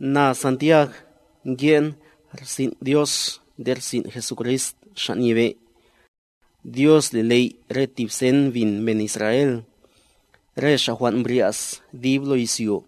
Na, Santiag, nke'n rsin' Dios nde rsin' Jesucrist Xa' Nyebe'. Dios li ley' re tib sen bin men Israel,a re xa' jwan' mbrya's dib lo izyo.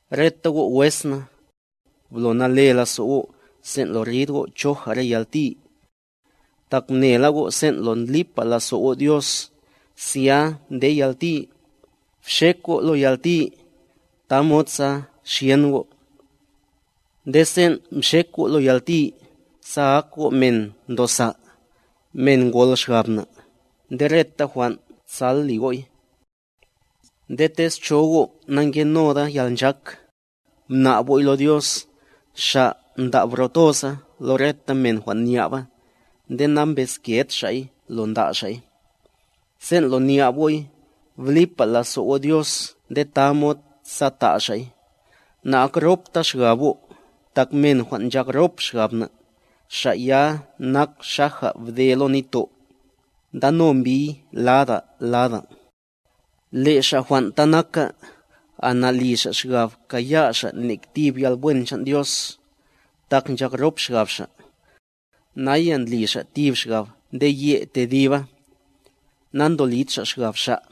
Reta go' wes na, bl nale lazo' go' sen' lo rid go' choja' re yalti. Tak mnela go' sen' lo ndlipa lazo' go' Dios, zya nde yalti, bxek go' lo yalti, tamod sa xyen go'. Nde sen' mxek go' lo yalti, sa ak go' men ndosa', men ngol xgab na', nde reta jwan' tsal li go'y. Nde tez cho go' nangenoda yalnchak, mna'b go'y lo Dios, Xa' nda' bro toza lo reta men jwan' nya'ba, nde nambezked Xa'y lo nda' Xa'y. Sen' lo nya'b go'y, blipa lazo' go' Dios nde tamod sa ta' Xa'y, na'akropta xgab go', tak men jwan' nchak rop xgab na', xa' ya nak xaja bde lo nitto', ndano mbiy lada lada. Le' xa' jwan' ta naka, ana'li xa' xgab kaya' xa' nek tib yalwen chan' Dios, tak nchak rop xgab xa'. Naya ndli xa' tib xgab nde ye' tediba, nantolid xa' xgab xa'.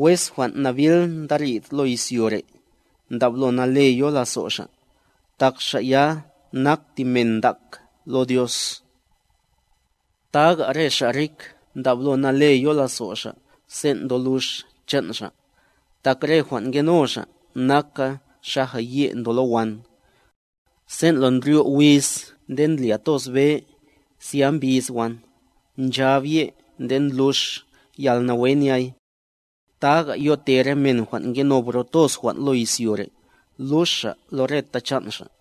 Wes jwan' nabil ndarid lo izyo re', ndablo nale yo lazo' xa', tak xa' ya nak tib men ntak lo Dios. Taga re xa' rik ndablo nale yo lazo' xa' sen' ndolux chan' xa', tak re jwan' ngeno xa' naka xaja ye' ndo lo wan. Sen' lo ndryo' wiz nde ndlya toz be, zya mbis wan, nchab ye' nde ndlux yalnawe nyay. Taga yote re men jwan' ngeno bro toz jwan' lo izyo re', lux xa' lo reta chan' xa'.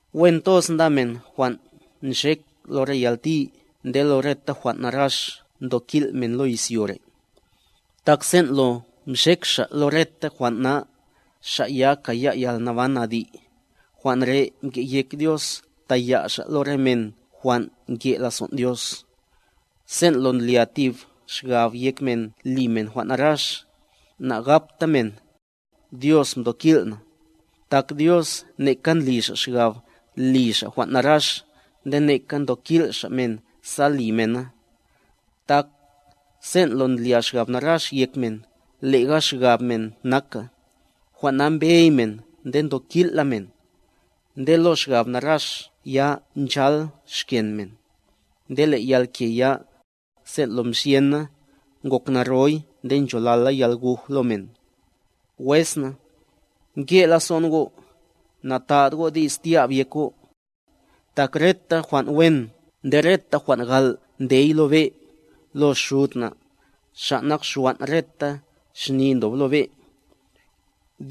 Wen toz nda men jwan' nxek lo re yalti nde lo reta jwan' narax ntokil' men lo izyo re'; tak sen' lo mxek xa' lo reta jwan' na, xa' ya kaya' yalnaban adi', jwan' re' mke' yek Dios taya' Xa' lo re men jwan' nke' lazon' Dios. Sen' lo ndlya tib xgab yek men li men jwan' narax, nagapta men: “Dios mtokil' na”, tak Dios neka ndli Xa' xgab li Xa' jwan' narax nde neka ntokil' Xa' men sa li mena. Tak, sen' lo ndlya xgab narax yek men, lega xgab men naka, jwan' na mbey men nde ntokil' la men. Nde lo xgab narax ya nchal xken men; nde le' yalke ya, sen' lo mxyen na, ngok naroy nde ncholala yalguj lo men. Wes na, nke' lazo'n go', nata'd go' di's tya'b yek go'. Tak reta jwan' wen nde reta jwan' gal' ndey lo be', lo Xud na', Xa' nak xwan' reta xni ndob lo be'.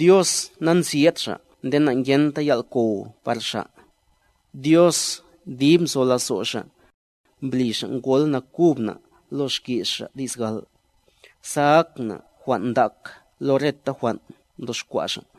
Dios nanzyed Xa' nde nangenta yal' kow par Xa'. Dios dib nzo lazo' Xa', mbli Xa' ngol nakub na' lo xki's Xa' di's gal', sa ak na' jwan' ndak lo reta jwan' mdoxkwa' Xa'.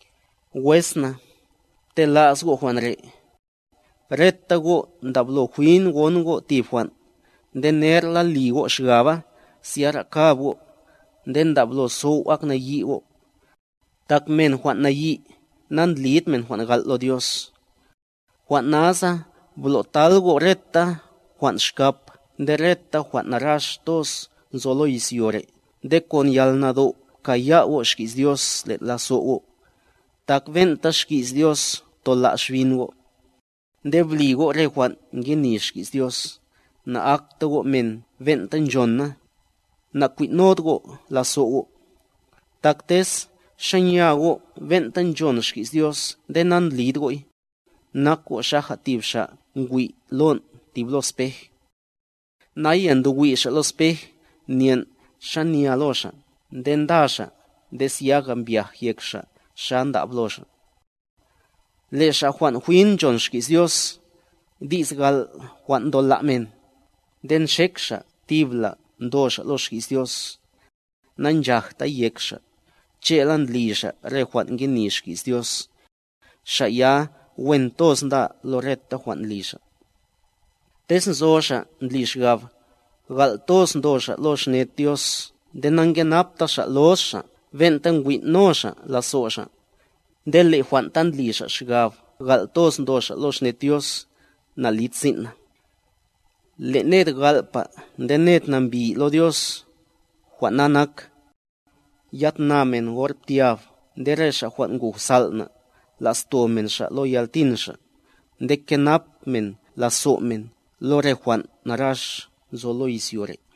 Wes na, pte'las go' jwan' re': Reta go' ndablo jwin gon go' tib jwan', nde nerla li go' xgaba zyara kab go', nde ndablo sow' ak nayi' go'. Tak men jwan' nayi', nandlid men jwan' gal' lo Dios. Jwan' nasa blo'tal go' reta jwan' xkap nde reta jwan' narax toz nzo lo izyo re' nde kon yalnado' pkaya' go' xki's Dios len' lazo' go', tak ben'ta xki's Dios tola' xbin go'. Nde bli go' re jwan' ngeni xki's Dios, na'akta go' men ben'ta nchon na, na'kwin'nod go' lazo' go'. Tak tez xanya go' ben'ta nchon xki's Dios nde nandlid go'y, nak go' xaja tib xa' ngwi' lon' tib lo spej. Naya ndo wi' xa' lo spej nyen' xanya lo xa' nde nda xa' nde zyaga mbyaj yek xa' xa ndab lo xa'. Le' xa' jwan' jwin nchon xki's Dios, di's gal' jwan' ntola' men, nde nxek xa' tibla' ndo xa' lo xki's Dios, nanchajtay yek xa', che'la ndli xa' re jwan' ngeni xki's Dios, xa' ya wen toz nda lo reta jwan' ndli xa'. Tez nzo xa' ndli xgab, gal' toz ndo xa' lo xned Dios nde nankenapta xa' loz xa' ben'ta nkwin'no xa' lazo' xa', nde le' jwan' ta ndli xa' xgab gal' toz ndo xa' lo xned Dios, nalid sin' na. Le' ned gal'pa nde ned nambi lo Dios, jwan' na nak: Ya tna men or ptyab nde re xa' jwan' nguj sal' na', la'sto men xa' lo yaltin xa', nde kenap men lazo' men lo re jwan' narax nzo lo izyo re'.